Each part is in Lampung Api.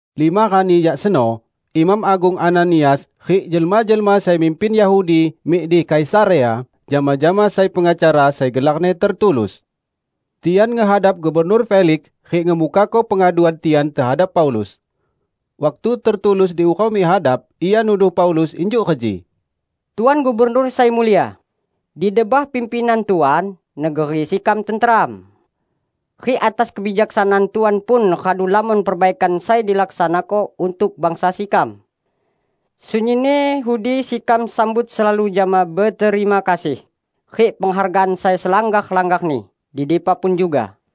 Lima rani jak seno, Imam Agung Ananias rik jelma-jelma sai mimpin Yahudi mik di Kaisarea jama-jama sai pengacara sai gelarni Tertulus. Tian ngehadap Gubernur Feliks rik ngemukako pengaduan tian tehadap Paulus. Waktu Tertulus diurau mik hadap, ia nuduh Paulus injuk reji, "Tuan Gubernur Sai Mulia! Di debah pimpinan Tuan negeri sekam tenteram. Rik atas kebijaksanaan Tuan pun radu lamon perbaikan sai dilaksanako untuk bangsa sekam. Sunyinni udi sekam sambut selalu jama beterima kasih rik penghargaan sai selanggar-langgarni di dipa pun juga.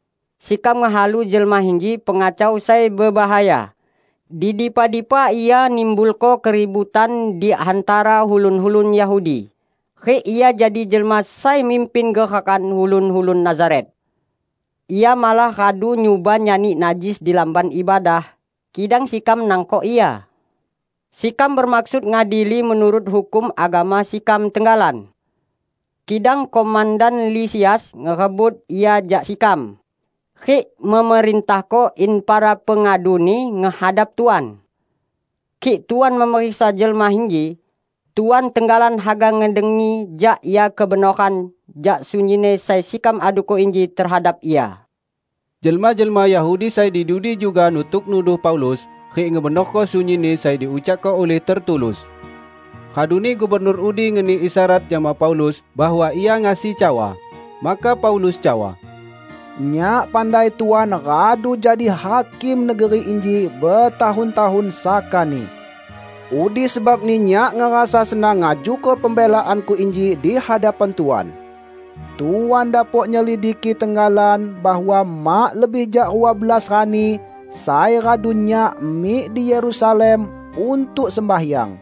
Sekam ngehalu jelma inji pengacau sai bebahaya. Di dipa-dipa ia nimbulko keributan di hantara ulun-ulun Yahudi rik ia jadi jelma sai mimpin gerakan ulun-ulun Nazaret. Ia malah radu nyuba nyani najis di Lamban Ibadah, kidang sekam nangkok ia. [Sekam bemaksud ngadili menurut hukum agama sekam tenggalan. Kidang komandan Lisias ngerebut ia jak sekam, rik memerintahko in para pengaduni ngehadap Tuan.] Kik Tuan memeriksa jelma inji, Tuan tenggalan haga ngedengi jak ia kebenoran jak sunyinni sai sekam aduko inji tehadap ia." Jelma-jelma Yahudi sai di dudi juga nutuk nuduh Paulus rik ngebenorko sunyinni sai diucakko ulih Tertulus. Raduni gubernur udi ngeni isyarat jama Paulus bahwa ia ngasi cawa. Maka Paulus cawa, "Nyak pandai Tuan radu jadi hakim negeri inji betahun-tahun sakani. Udi sebabni nyak ngerasa senang ngajuko pembelaanku inji di hadapan Tuan. Tuan dapok nyelidiki tenggalan bahwa mak lebih jak rua belas rani sai radu nyak mik di Yerusalem untuk sembahyang.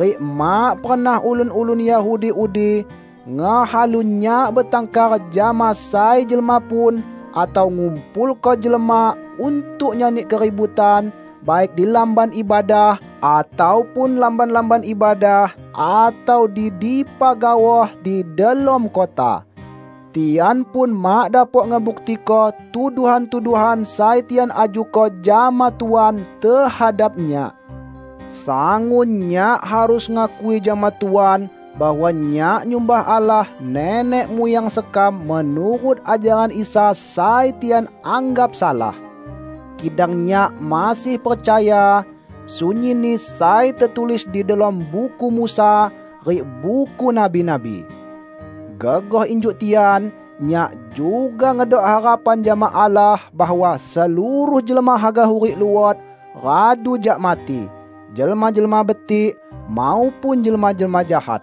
Rik mak pernah ulun-ulun Yahudi udi ngehalu nyak betangkar jama sai jelma pun atau ngumpulko jelma untuk nyani keributan baik di Lamban Ibadah ataupun lamban-lamban ibadah atau di dipa gaoh di delom kota. Tian pun mak dapok ngebuktiko tuduhan-tuduhan sai tian ajuko jama Tuan tehadap nyak. Sangun nyak harus ngakui jama Tuan bahwa nyak nyumbah Allah nenek muyang sekam menurut ajaran Isa sai tian anggap salah. Kidang nyak masih percaya, sunyinni sai tetulis di delom Buku Musa rik Buku Nabi-nabi. Gegoh injuk tian, nyak juga ngedok harapan jama Allah bahwa seluruh jelma haga hurik luot radu jak mati -- jelma-jelma betik, maupun jelma-jelma jahat!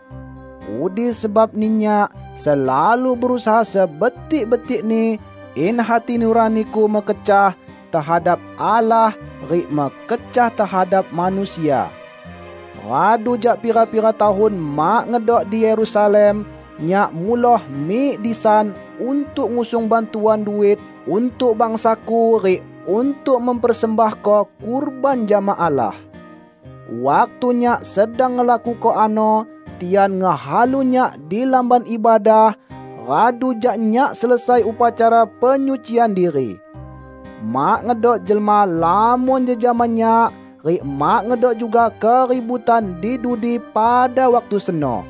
Udi sebabni nyak selalu berusaha sebetik-betikni, in hati nuraniku mekecah tehadap Allah rik mekecah tehadap manusia. Radu jak pira-pira tahun mak ngedok di Yerusalem, nyak muloh mik disan untuk ngusung bantuan duit untuk bangsaku rik untuk mempersembahko kurban jama Allah. Waktu nyak sedang ngelakuko ano, tian ngehalu nyak di Lamban Ibadah, radu jak nyak selesai upacara penyucian diri. Mak ngedok jelma lamon jejama nyak, rik mak ngedok juga keributan di dudi pada waktu seno.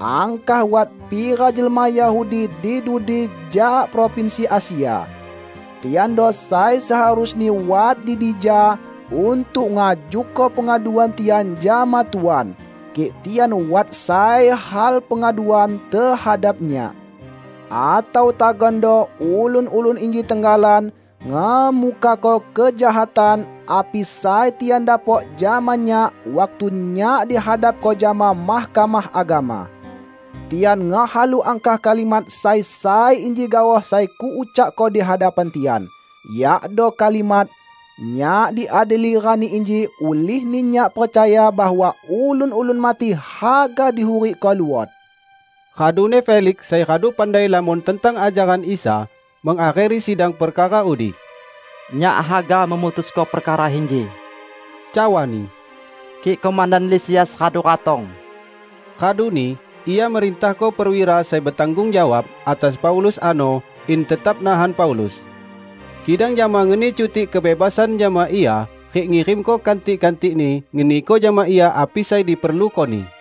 Angkah wat pira jelma Yahudi di dudi jak provinsi Asia. Tiando sai seharusni wat di dija untuk ngajuko pengaduan tian jama Tuan, kik tian wat sai hal pengaduan tehadap nyak. Atau tagando ulun-ulun inji tenggalan ngemukako kejahatan api sai tian dapok jama nyak waktu nyak dihadapko jama Mahkamah Agama. Tian ngehalu angkah kalimat sai sai inji gaoh sai kuucakko di hadapan tian, yakdo kalimat: Nyak diadili rani inji ulihni nyak percaya bahwa ulun-ulun mati haga dihurikko luot." Raduni Feliks sai radu pandai lamon tentang ajaran Isa, mengakheri sidang perkara udi. "Nyak haga memutusko perkara inji," cawani, "kik komandan Lisias radu ratong." Raduni ia merintahko perwira sai betanggung jawab atas Paulus ano in tetap nahan Paulus, kidang jama ngeni cutik kebebasan jama ia rik ngirimko kantik-kantikni ngeniko jama ia api sai diperlukoni.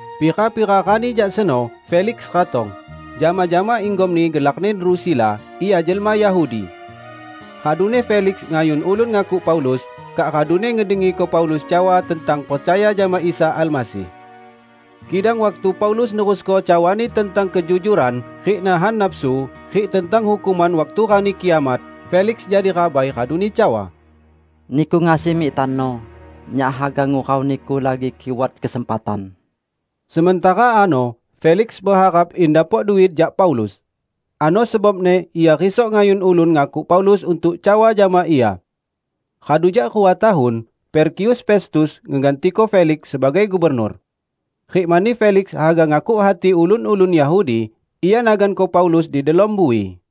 Pira-pira rani jak seno Feliks ratong, jama-jama inggomni gelarni Drusila; ia jelma Yahudi. Raduni Feliks ngayun ulun ngakuk Paulus, kak raduni ngedengiko Paulus cawa tentang percaya jama Isa Almasih. Kidang waktu Paulus nerusko cawani tentang kejujuran rik nahan nafsu rik tentang hukuman waktu Rani Kiamat, Feliks jadi rabai raduni cawa, "Niku ngasi mik tano. Nyak haga ngurau niku lagi kik wat kesempatan." Sementara ano Feliks beharap in dapok duit jak Paulus. Ano sebabni ia risok ngayun ulun ngakuk Paulus untuk cawa jama ia. Radu jak rua tahun, Perkius Festus ngegantiko Feliks sebagai gubernur. Rik mani Feliks haga ngakuk hati ulun-ulun Yahudi, ia naganko Paulus di delom bui.